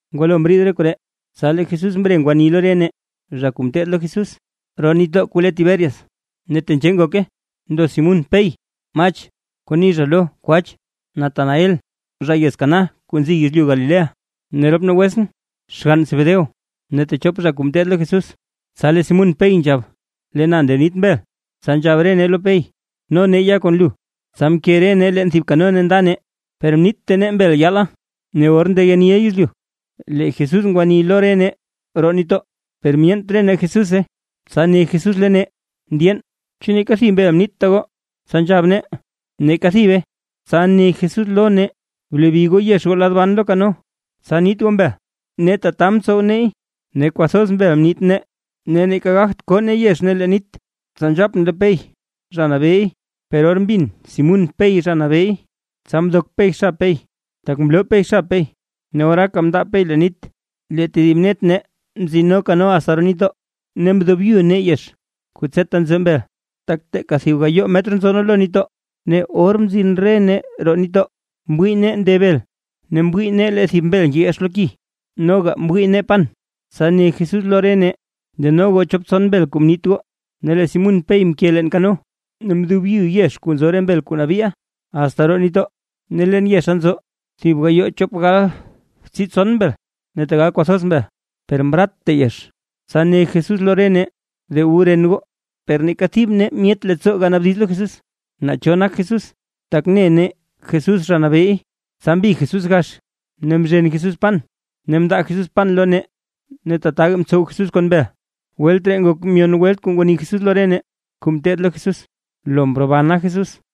Ngwalo mriid re koree, tsa lee Jesús mre ngwani lo re nee zha kuu mteed lo Jesús roo nitdoo kuu le Tiberias, ne tenzhee ngoke: Ndo Simún Pey, Mach (kuu ni zha lo “kwach”), Natanael (zha yez Caná yez kuu nzi yezlyu Galilea), ne rop nee wetsʼn (xgann Zebedeo), ne techop zha kuu mteed lo Jesús. Tsa lee Simún Pey nzhab: ―Lee na nda niit mbel. Tsa nzhab re nee lo Pey: ―No nee ya kon lu. Tsa mke re nee leen thib kano ne nda nee, per mniitta nee mbel yaala. Ne or ndeyeniʼa yezlyu, lee Jesús ngwani lo re nee roo nitdoo, per myeent re nee Jesúse. Tsa ne Jesús lo nee: ―Mndyeen, ¿chu neeka thib mbel mniitta goo? Tsa nzhab nee: ―Neeka thibe. Tsa ne Jesús lo nee: ―Blebi goo yex goo lad ban lo kano, tsa niit goo mbel. Ne tata mtsow neey, ne kwathoz mbel mniit nee ne neeka gagt koo nee yex leen nit. Tsa nzhapʼn lo Pey: ―¡Zha Nabeey! Per or mbin Simún Pey, Zha Nabeey, tsa mdok Pey xab Pey, tak mloo Pey xab ne oraaka mndaab Pey leen nit. Lee tedib net nee mtsino kano asta roo nitdoo, ne mdobyu nee yex kuu tseta nzo mbel, tak teeka thib gayoo metr nzo nee lo nitdoo. Ne or mzin re nee roo nitdoo, mwii nee nde bel, ne mwii nee lee thib mbel ngeyex lo ki, noga mwii nee pan. Tsa ne Jesús lo re nee: ―Deno goo chop tson mbel kuu mniit goo. Ne lee Simún Pey mke leen kano, ne mdobyu yex kuu nzo re mbel kuu nabii, asta roo nitdoo, ne leen yexa nzo thib gayoo chop galbtsii btson mbel, ne tegal kwathoz mbel, per mratta yex. Tsa ne Jesús lo re nee: ―De wu ren goo. Per neeka thib nee myet leettsoo ganaabdiz lo Jesús, naa cho nak Jesús. Tak ne nee Jesús Zha Nabeey. Tsa mbig Jesús gax ne mzhen Jesús pan ne mndaa Jesús pan lo nee; ne tataga mtsow Jesús kon mbel. Welt ree ngok myon welt kuu ngwani Jesús lo re nee, kuu mteed lo Jesús, lo mrobana Jesús.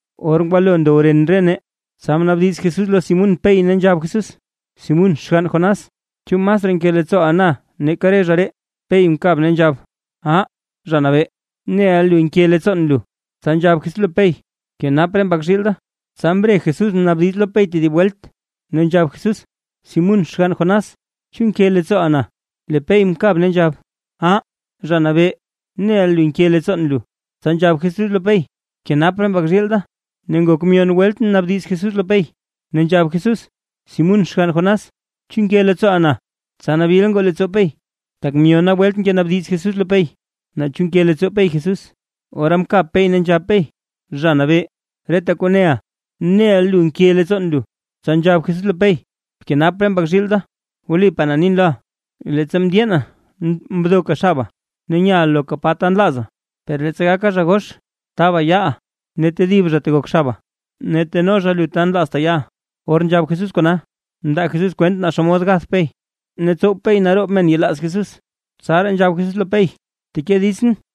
Or ngwalo ndow ren re nee, tsa mnaabdiz Jesús lo Simún Pey ne nzhab Jesús: ―Simún xgann Jonás, ¿chu masraa nke leettsooʼa na nake re zha ree? Pey mkab ne nzhab: ―Ah Zha Nabee, neʼa lu nke leettsoon lu. Tsa nzhab Jesús lo Pey: ―Bkenap re mbak zhiil da. Tsa mbre Jesús mnaabdiz lo Pey tedib welt, ne nzhab Jesús: ―Simún xgann Jonás, ¿chu nke leettsooʼa na? Lee Pey mkab nzhab: ―Ah, Zha Nabee, neʼa lu nke leettsoon lu. Tsa nzhab Jesús lo Pey: ―Bkenap re mbak zhiil da. Ne ngok myon welt mnaabdiz Jesús lo Pey, ne nzhab Jesús: ―Simún xgann Jonás, ¿chu nke leettsooʼa na? Tsa nabil ngoo leettsoo Pey, tak myona welt ngenaabdiz Jesús lo Pey, naa chu nke leettsoo Pey Jesús. Ora mkab Pey ne nzhab Pey: ―Zha Nabee, reta kuu neʼa, neʼa lu nke leettsoon lu. Tsa nzhab Jesús lo Pey: ―Bkenap re mbak zhiil da. Wlipaa na nin loʼa. Leettsa mndyeena mdoka xaba, ne nyaʼa loka pa ta nlaaza, per leettsa gaka zha gox, taaba yaaʼa ne tedib zha tegok xaba, ne teno zha lu ta nlaazta yaʼa. Or nzhab Jesús kona, mndaa Jesús kwent naa xomod gath Pey, ne tsow Pey naroob men yelaaz Jesús. Tsaraa nzhab Jesús lo Pey: ―¡Bteke ditsʼn!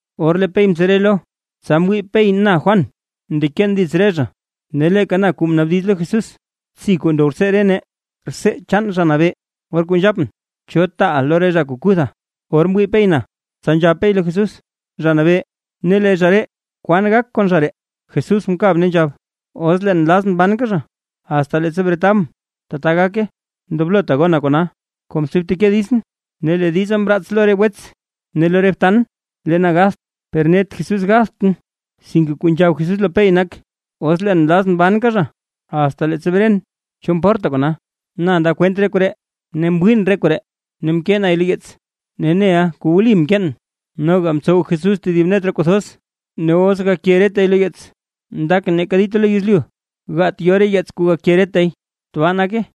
Or lee Pey mtsere lo, tsa mwii Pey na Juan ndeken dits re zha. Ne leeka na kuu mnaabdiz lo Jesús btsi kuu ndow rtsee re nee, rtsee chaan Zha Nabee, or kuu nzhapʼn, ¿cho taaʼa lo re zha kuu kutha? Or mwii Pey na, tsa nzhab Pey lo Jesús: ―Zha Nabee, ne lee zha ree, ¿kwan gak kon zha ree? Jesús mkab ne nzhab: ―Os leen nlazʼn banka zha, asta leettsa bretabʼn, tata gake. ¡Ndoblota gona kona! Komsi bteke ditsʼn. Ne lee diza mraats lo re wets ne lo re btan lee na gatht, per net Jesús gathtʼn, sinke kuu nzhab Jesús lo Pey nak: “Os leen nlazʼn banka zha asta leettsa bren, ¿cho mporta kona?” Na ndaa kwent re koree, mwiin re koree ne mkee nay lo yeets. Ne, neʼaa wli kuu mkeen. Noga mtsow Jesús tedib net re kuu thoz; ne os gake retay lo yeets, ndakʼn neeka dita lo yezlyu gaat yo re yeets kuu gake retay. Tbaa nake.